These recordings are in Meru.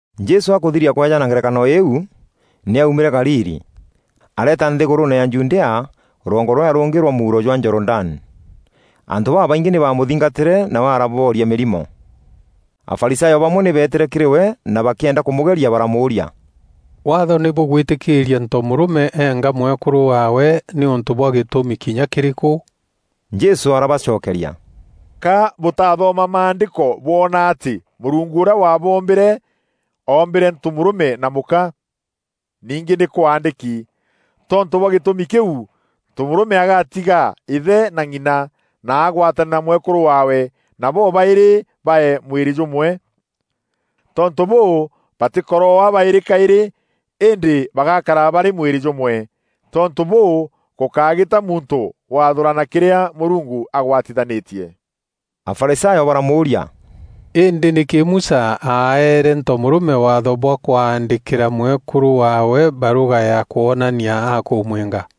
Jesû akûthiria kweejana ngerekano îîu, nî aumîre Galili, areeta nthîgûrûûne ya Judea, rwongo rûrîa rûngî rwa mûuro jwa Jorodani. Antû babaingî nî bamûthingatîre nawe arabooria mîrimo. Afarisayo bamwe nî beetîre kîrî we na bakîenda kûmûgeria baramûûria, “Waatho nî bûgwîtîkîîria ntomûrûme eenga mwekûrû waawe nîûntû bwa gîtûmi kinya kîrîkû?” Jesû arabacokeria, “Ka bûtathoma maandîko bwona atî Mûrungu ûrîa waaboombîre, oombîre ntomûrûme na mûka? Ningî nî kwaandîki, ‘Tontû bwa gîtûmî kîu ntomûrûme agatiga îthe na ng'ina, na agwatane na mwekûrû waawe, na bobaîrî baee mwîrî jûmwe?’ Tontû bûû, batîkoroaa baîrî kaîrî, îndî bagakara barî mwîrî jûmwe. Tontû bûû, gûkágîta muntû waathûûrana kîrîa Mûrungu agwatîthanîtie.” Afarisayo baramûûria, “Îndî nîkî Musa aeere ntomûrûme waatho bwa kwaandîkîra mwekûrû waawe barûga ya kwonania akûmwînga?”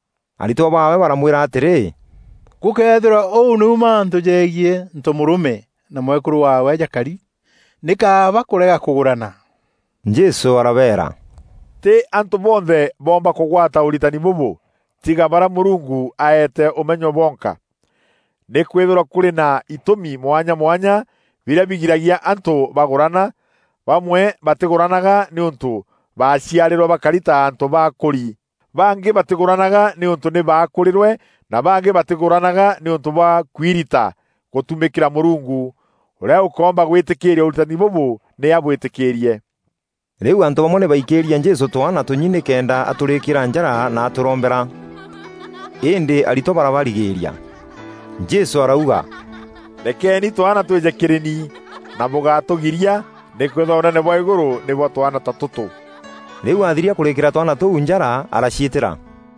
Aritwa baawe baramwîra atîrî, “Gûkëethîrwa ûu nîu mantû jegiî ntomûrûme na mwekûrû waawe jakari, nî kaaba kûrega kûgûrana.” Jesû arabeera, “Tî antû bonthe boomba kûgwata ûritani bûbû, tiga barîa Mûrungu aete ûmenyo bonka. Nîkwîthîrwa kûrî na itûmi mwanya mwanya birîa bigiragia antû bagûrana: bamwe batîgûranaga nîûntû baaciarîrwe bakari ta antû baakûri, bangî batîgûranaga nîûntû nî baakûrîrwe na bangî batîgûranaga nîûntû bwa kwirita gûtumîkîra Mûrungu. Ûrîa ûkoomba gwîtîkîîria ûritani bûbû nî abwîtîkîîrie.” Rîu antû bamwe nî baikîrie Jesû twaana tûnyi nîkenda atûrîkîîra njara na atûrombera; îndî aritwa barabarigîîria. Jesû arauga, “Rekeeni twaana twîje kîrî ni, na bûgatûrigîîria nîkwîthîrwa Ûnene bwa îgûrû nî bwa twaana ta tûtû.” Rîu athiria kûrîîkîra twaana tûu njara araciîtîra.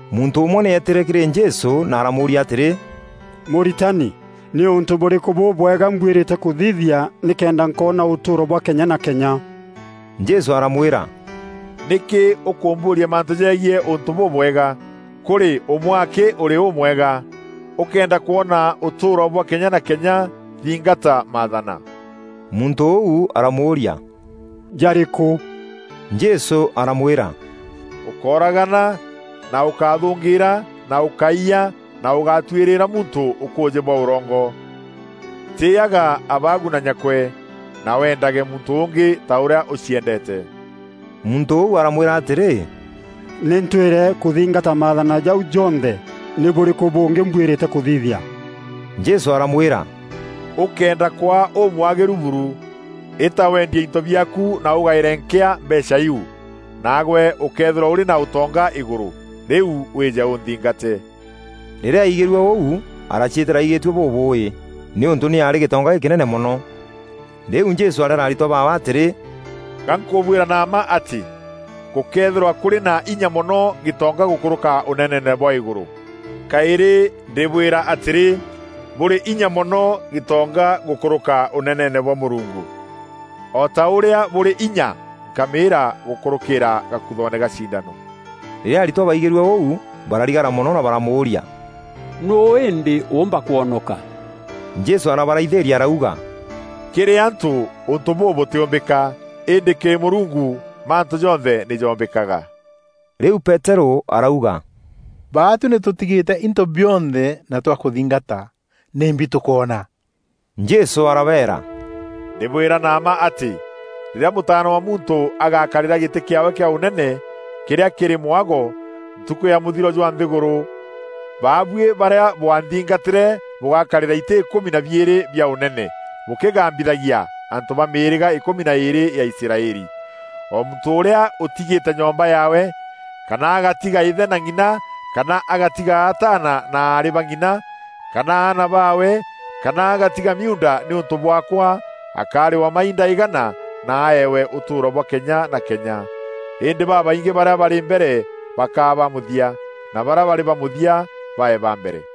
Muntû ûmwe nî eetîre kîrî Jesû na aramûûria atîrî, “Mûritani, nî ûntû bûrîkû bûbwega mbwîrîte kûthithia nîkenda nkoona ûtûûro bwa kenya na kenya?” Jesû aramwîra, “Nîkî ûkûmbûûria mantû jegiî ûntû bûbwega? Kûrî ûmwe akî ûrî ûmwega. Ûkëenda kwona ûtûûro bwa kenya na kenya, thingata Maathana.” Muntû ûu aramûûria, “Jarîkû?” Jesû aramwîra, “Ûkóragana na ûkáthûngîîra na ûkáiya na ûgátwîrîîra muntû ûkûûjî bwa ûrongo. Tîîyaga abaagu na nyakwe, na weendage muntû ûngî ta ûrîa ûciendeete.” Muntû ûu aramwîra atîrî, “Nî ntwîre kûthingata Maathana jau jonthe. Nî bûrîku bûngî mbwîrîte kûthithia?” Jesû aramwîra, “Ûkëenda kwaa ûmwagîru buru, îta wendie into biaaku na ûgaîre nkîa mbeecha iu, naagwe ûkeethîrwa ûrî na ûtonga îgûrû; rîu wîîje ûnthingate.” Rîrîa aigîrue ûu araciîtîra aigîtue bûbûûî, nîûntû nî aarî gîtonga gîkînene mono. Rîu Jesû areera aritwa baawe atîrî, “Gankûbwîra na mma atî gûkeethîrwa kûrî na inya mono gîtonga gûkûrûka Ûneneene bwa îgûrû. Kaîrî ndîbwîra atîrî, bûrî inya mono gîtonga gûkûrûka Ûneneene bwa Mûrungu, o ta ûrîa bûrî inya nkamîîra gûkûrûkîîra gakuthoone ga cindano.” Rîrîa aritwa baigîrue ûu bararigara mono na baramûûria, “Nûû îndî ûûmba kwonoka?” Jesû arabaraithîîria arauga, “Kîrî antû, ûntû bûu bûtîûmbîka, îndî kîrî Mûrungu mantû jonthe nî jombîkaga.” Rîu Peterû arauga, “Baatuî nî tûtigîte into bionthe na twakûthingata, nîmbi tûkoona?” Jesû arabeera, “Ndîbwîra na mma atî, rîrîa Mûtaana wa Muntû agakarîra gîtî kîaawe kîa Ûnene, kîrîa kîrî mwago, ntukû ya mûthiro jwa nthîgûrû, baabuî barîa bwanthingatîre bûgakarîra itî îkûmi na biîrî bia ûnene, bûkîgambithagia antû ba mîîrîga îkûmi na îîrî ya Israeli. O muntû ûrîa ûtîgîte nyomba yaawe, kana agatiga îthe na ng'ina kana agatiga ataana na aarî ba ng'ina, kana aana baawe kana agatiga miuunda nîûntû bwaakwa, akarîwa mainda îgana, na aewe ûtûûro bwa kenya na kenya. Îndî babaingî barîa barî mbere bakaa ba mûthia, na barîa barî ba mûthia bae ba mbere.”